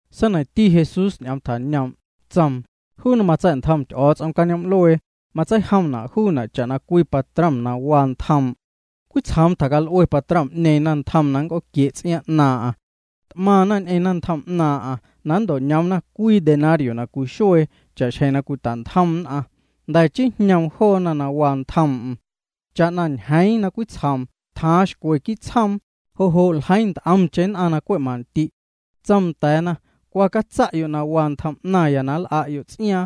Seineiⁿti Jesús ñ'oom tjañoom', tsoom: —Juu na matsa̱'ntjom Ty'o̱o̱ts'om cañoom'luee, matseijomna' juuna' cha'na cwii patrom na waa ntjoom'. Cwitsjoom tjacal'ue patrom'ñeeⁿ naⁿntjom na nnc'ooquie' ts'iaaⁿ 'naaⁿ'aⁿ. T'maⁿna ñ'eⁿ naⁿntjom 'naaⁿ'aⁿ na nnto'ñoomna cwii denario na cwii xuee cha'xjeⁿ cwita'ntjom nn'aⁿ. Jnda̱ chii jñoom joona na waa ntjoom'm. Cha'na ñjeeⁿ na cwitsjoom tjaaⁿ xcwe quii' tsjoom, jo' jo' ljeiiⁿ nt'omcheⁿ nn'aⁿ na cwe' mandi'. Tsoom nda̱a̱na: “Cwa catsa'yo' na waa ntjom 'naⁿya na nl'a'yo' ts'iaaⁿ.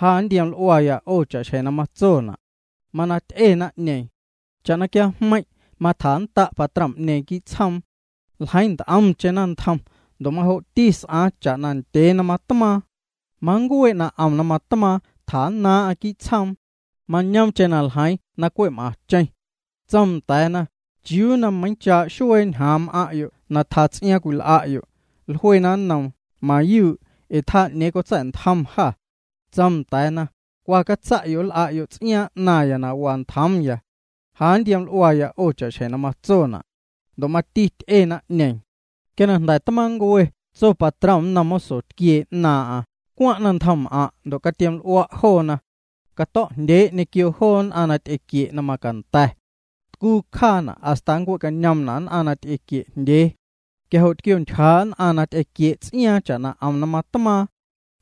Ja nntioml'uaya 'o cha'xjeⁿ na matsona'.” Mana ty'e naⁿ'ñeeⁿ. Cha'na quiajmeiⁿ' matjannda' patrom'ñeeⁿ quii' tsjoom. Ljeiiⁿ nt'omcheⁿ naⁿntjom. Ndo' majo'ti s'aaⁿ cha'na ndyee na matmaaⁿ. Manncuee' na 'om na matmaaⁿ, tjannaaⁿ'aⁿ quii' tsjoom. Mañoomcheⁿ na ljeiiⁿ na cwe' m'aⁿcheⁿ. Tsoom nda̱a̱na: “¿Chiuu na meiiⁿchaa' xuee ñjaaⁿ m'aⁿ'yo' na tjaa ts'iaaⁿ cwil'a'yo'?” Jluena nnoom: “Mayuu', ee tjaa 'ñeeⁿ cotsa̱'ntjom jâ.” Tsoom nda̱a̱na: “Cwa catsa'yo', nl'a'yo' ts'iaaⁿ 'naⁿya na waa ntjoomya. Ja nntioml'uaya 'o cha'xjeⁿ na matsona'.” Ndo' mati ty'e naⁿ'ñeeⁿ. Quia na jnda̱ tmaaⁿncue tso patrom nnom moso tquiee 'naaⁿ'aⁿ: “Cwaⁿ' naⁿntjomm'aⁿ' ndo' catiom'l'ua' joona. Cato̱'jndyee' ñequio joo nn'aⁿ na ty'equie' na macanda̱. Tcuu cjaana' hasta nncuee'cañoomna' nn'aⁿ na ty'equie'jndyee.” Quia jo' tquiontyjaa' nn'aⁿ na ty'equie' ts'iaaⁿ cha'na 'om na matmaaⁿ.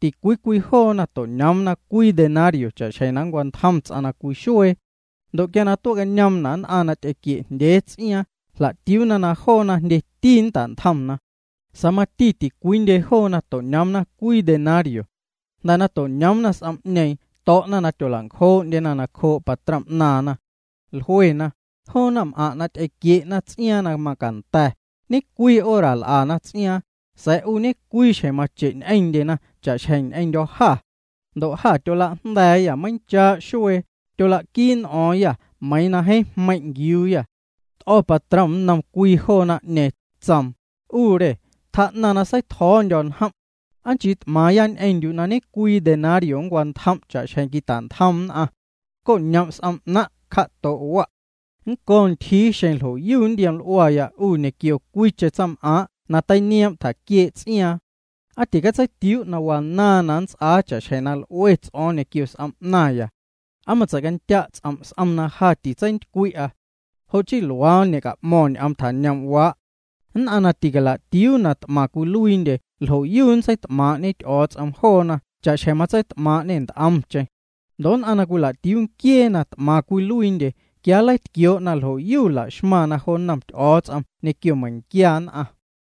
Ticwii cwii joona to'ñoomna cwii denario cha'xjeⁿ na nncwantjom ts'aⁿ na cwii xuee. Ndo' quia tuee'cañoomna' nn'aⁿ na ty'equie'jndyee ts'iaaⁿ, jla'tiuuna na joona jndyeti nnta'ntjomna. Sa̱a̱ mati ticwiindye joona to'ñoomna cwii denario. Jnda̱ na to'ñoomna s'om'ñeeⁿ to̱'na na tyola'ncjoo'ndyena nacjoo' patrom 'naaⁿna. Jluena: “Joo naⁿm'aⁿ' na ty'equie'na ts'iaaⁿ na macanda̱, ñecwii hora l'ana ts'iaaⁿ, sa̱a̱ 'u ñe'cwii xjeⁿ mache' ñ'eⁿndye joona cha'xjeⁿ ñ'eⁿndyô̱ jâ. Ndo' jâ tyolajnda̱a̱yâ meiiⁿchaa' xuee, tyolaquii n'o̱o̱ⁿyâ meiiⁿ jeeⁿ jmeiⁿ' nquiuuyâ.” T'o̱ patrom nnom cwii joo naⁿ'ñeeⁿ, tsoom: “'U re, tjaa'naⁿ na seitjo̱o̱ndyo̱ njom'. ¿Aa nchii t'maaⁿya ñ'eⁿndyu' na cwii denario nncwantjom' cha'xjeⁿ quita'ntjom nn'aⁿ? Co'ñom' s'om 'naⁿ', cja'to' wa'. Nnco̱ ntyjii xeⁿ ljo'yu nntioml'uaya 'u ñequio cwiicheⁿ tsaⁿm'aaⁿ' na teinioom' tjaquiee' ts'iaaⁿ. ¿Aa ticatseitiuu' na wanaaⁿ na nnts'aa cha'xjeⁿ na l'ue ts'o̱o̱ⁿ ñequio s'om 'naⁿya? ¿Aa matsei'candya' ts'om' s'om na ja titseintycwi'a?” Jo' chii luaa ñe'ca'mo̱ⁿ ñ'oom tjañoom'waa'. Nn'aⁿ na ticala'tiuu na t'maⁿ cwiluiindye ljo'yu nntseit'maaⁿ'ñe Ty'o̱o̱ts'om joona cha'xjeⁿ matseit'maaⁿ'ñê nt'omcheⁿ. Ndo' nn'aⁿ na cwila'tiuu nquiee na t'maⁿ cwiluiindye, quia nleitquioo' na ljo'yu la'xmaⁿna jo nnom Ty'o̱o̱ts'om ñequio meiⁿnquia nn'aⁿ.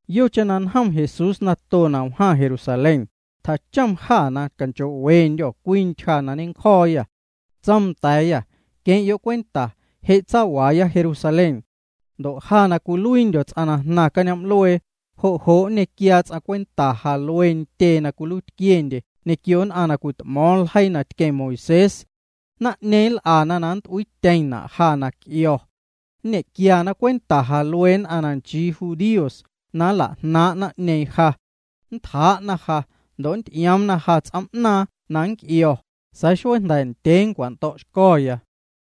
Yocheⁿ na njom Jesús nato na wjaⁿ Jerusalén, tjachom jâ na canchoo'wendyô̱ cwii ntyja na ñencjo̱o̱yâ. Tsoom nda̱a̱yâ: —Queⁿ'yo' cwenta, je' tsawaaya Jerusalén. Ndo' ja na cwiluiindyo̱ ts'aⁿ na jnaⁿ cañoom'luee, jo' jo' nñequiaa ts'aⁿ cwenta ja luee ntyee na cwiluiitquiendye ñequio nn'aⁿ na cwit'mo̱o̱ⁿ ljeii na tqueⁿ Moisés. Naⁿ'ñeeⁿ nl'ana na nnt'uiityeⁿna' ja na nnc'io̱. Nñe'quiana cwenta ja luee nn'aⁿ na nchii judíos na nla'jnaaⁿ' naⁿ'ñeeⁿ ja. Nntjaa'na ja ndo' nnty'ioomna ja ts'oom'naaⁿ na nnc'io̱, sa̱a̱ xuee jnda̱ ndyee nncwando̱'xco̱.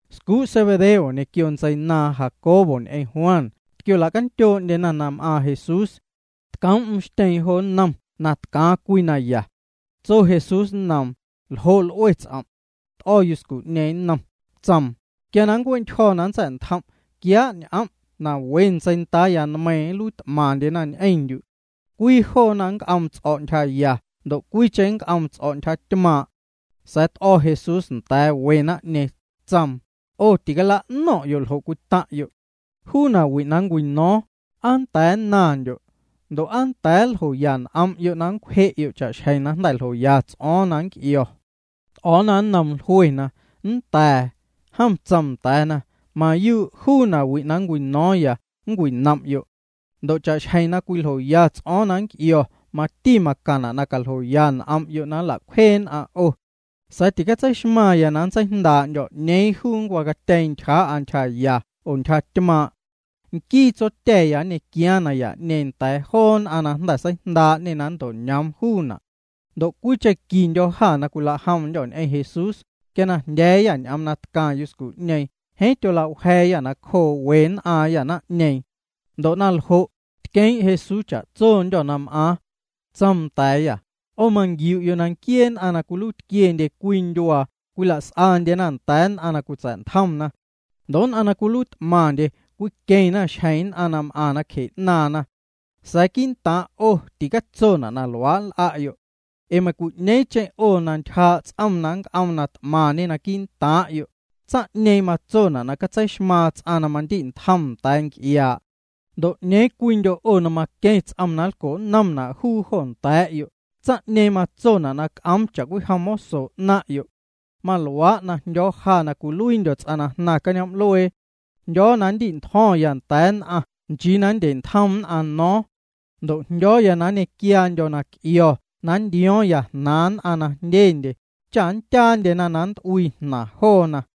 Scuu' Zebedeo ñequio ntseinaaⁿ Jacobo ñ'eⁿ Juan tquiola'candyoo'ndyena na m'aaⁿ Jesús. Tcoom'm xtyeeⁿ jo nnom na tcaaⁿ cwii naya. Tso Jesús nnoom: —¿Ljo' l'ue ts'om'? T'o̱ yuscu'ñeeⁿ nnom, tsoom: —Quia na nncue'ntyjo̱ na nntsa̱'ntjom', quiaa' ñ'om' na we ntseindaaya nmeiiⁿ nluiit'maⁿndyena ñ'eⁿndyu'. Cwii joona nnc'oom ts'o̱' ntyjaya ndo' cwiicheⁿ nnc'oom ts'o̱' ntyjatymaaⁿ'. Sa̱a̱ t'o̱ Jesús nda̱a̱ we naⁿ'ñeeⁿ, tsoom: —'O ticala'no̱ⁿ'yo' ljo' cwitaⁿ'yo'. Juu nawi' na nncwino̱o̱ⁿ, ¿aa nnda̱a̱ nnaⁿndyo'? Ndo' ¿aa nnda̱a̱ nljoya n'om'yo' na nncwje'yo' cha'xjeⁿ na jnda̱ ljoya ts'o̱o̱ⁿ na nnc'io̱? T'o̱o̱na nnoom, jluena: —Nnda̱a̱. Jom tsoom nda̱a̱na: —Mayuu' juu nawi' na nncwino̱o̱ⁿya, nncwinom'yo'. Ndo' cha'xjeⁿ na cwiljoya ts'o̱o̱ⁿ na nnc'io̱ mati macaⁿna' na caljoya n'om'yo' na nla'cwjee nn'aⁿ 'o. Sa̱a̱ titseixmaⁿya na nntseijndaa'ndyo̱ 'ñeeⁿ juu nncwacatyeeⁿ ntyjaa'a ntyjaya oo ntyjatymaaⁿ'. Nquii Tsotya̱ya nñequiaaⁿ naya'ñeeⁿ nda̱a̱ joo nn'aⁿ na jnda̱ seijndaa'ñê na nnto'ñoom juuna'. Ndo' cwiicheⁿ quindyô̱ jâ na cwila'jomndyô̱ ñ'eⁿ Jesús, quia na jndya̱a̱yâ ñ'oom na tcaⁿ yuscu'ñeeⁿ, jeeⁿ tyola'wja̱a̱yâ nacjoo we nn'aaⁿyâ naⁿ'ñeeⁿ. Ndo' naljo', tqueeⁿ' Jesús cha'tsondyô̱ na m'aaⁿ. Tsoom nda̱a̱yâ: —'O manquiu'yo' na nquiee nn'aⁿ na cwiluiitquiendye cwii cwii ndyuaa cwila's'andyena nda̱a̱ nn'aⁿ na cwitsa̱'ntjomna. Ndo' nn'aⁿ na cwiluiit'maⁿndye cwiqueⁿna xjeⁿ nn'aⁿ na m'aⁿ nacje 'naaⁿna. Sa̱a̱ quii'ntaaⁿ 'o ticatsona' na luaa' nl'a'yo'. Ee meiⁿcwi'ñeeⁿcheⁿ 'o na ntyjaa' ts'om na nnc'oom na t'maⁿñe naquii' ntaaⁿ'yo', tsaⁿ'ñeeⁿ matsona' na catseixmaaⁿ ts'aⁿ na mandi'ntjom nda̱a̱ nc'iaa'. Ndo' 'ñeeⁿ cwiindyo' 'o na maqueⁿ ts'om na nlco'nnomna' juu jo nda̱a̱'yo', tsaⁿ'ñeeⁿ matsona' na c'oom cha'cwijom moso 'naⁿ'yo'. Maluaa' na jndyo̱o̱ ja na cwiluiindyo̱ ts'aⁿ na jnaⁿ cañoom'luee. Jndyo̱o̱ na nndi'ntjo̱ⁿya nda̱a̱ nn'aⁿ nchii na nndye'ntjom nn'aⁿ no̱o̱ⁿ. Ndo' jndyo̱o̱ na nñequiaandyo̱ na c'io̱ na nntio̱o̱ⁿya jnaaⁿ nn'aⁿ na jndyendye, cha nndyaandyena na nnt'uii jnaaⁿna joona.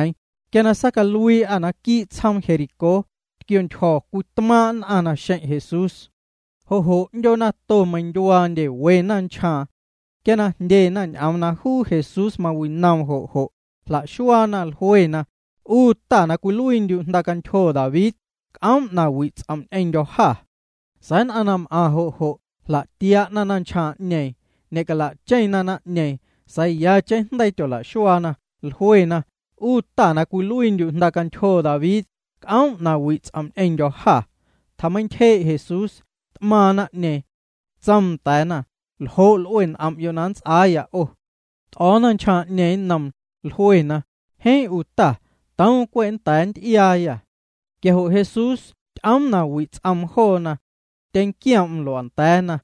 Quia na saacaluii'â naquii' tsjoom Jericó, tquiontyjo̱ cwii tmaaⁿ' nn'aⁿ naxeⁿ' Jesús. Jo' jo' 'ndyoo nato meindyuaandye we naⁿnchjaaⁿ. Quia na jndyena ñ'oom na juu Jesús mawinoom jo' jo', jla'xuaana, jluena: —'U Ta, na cwiluiindyu' jndacantyjo David, c'oom' na wi' ts'om' ñ'eⁿndyô̱ jâ. Sa̱a̱ nn'aⁿ na m'aⁿ jo' jo' jla'tia'na naⁿnchjaaⁿ'ñeeⁿ. Ñe'cala'cheⁿna naⁿ'ñeeⁿ, sa̱a̱ yacheⁿ jndeii tyola'xuaa, jlue: —'U Ta, na cwiluiindyu' jndacantyjo David, c'oom' na wi' ts'om' ñ'eⁿndyô̱ jâ. Tjameintyjee' Jesús, t'maaⁿ naⁿ'ñeeⁿ. Tsoom nda̱a̱na: —¿Ljo' l'ue n'om'yo' na nnts'aaya 'o? T'o̱o̱ naⁿnchjaaⁿ'ñeeⁿ nnoom, jluena: —Jeeⁿ 'u ta, toom cwe' nnda̱a̱ nnty'iaayâ. Quia jo' Jesús ty'oom na wi' ts'oom joona. Tyeⁿnquioom'm lua'nda̱a̱na.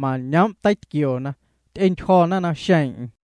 Mañoom' teitquioona. Ty'entyjo̱na naxeeⁿ'eⁿ.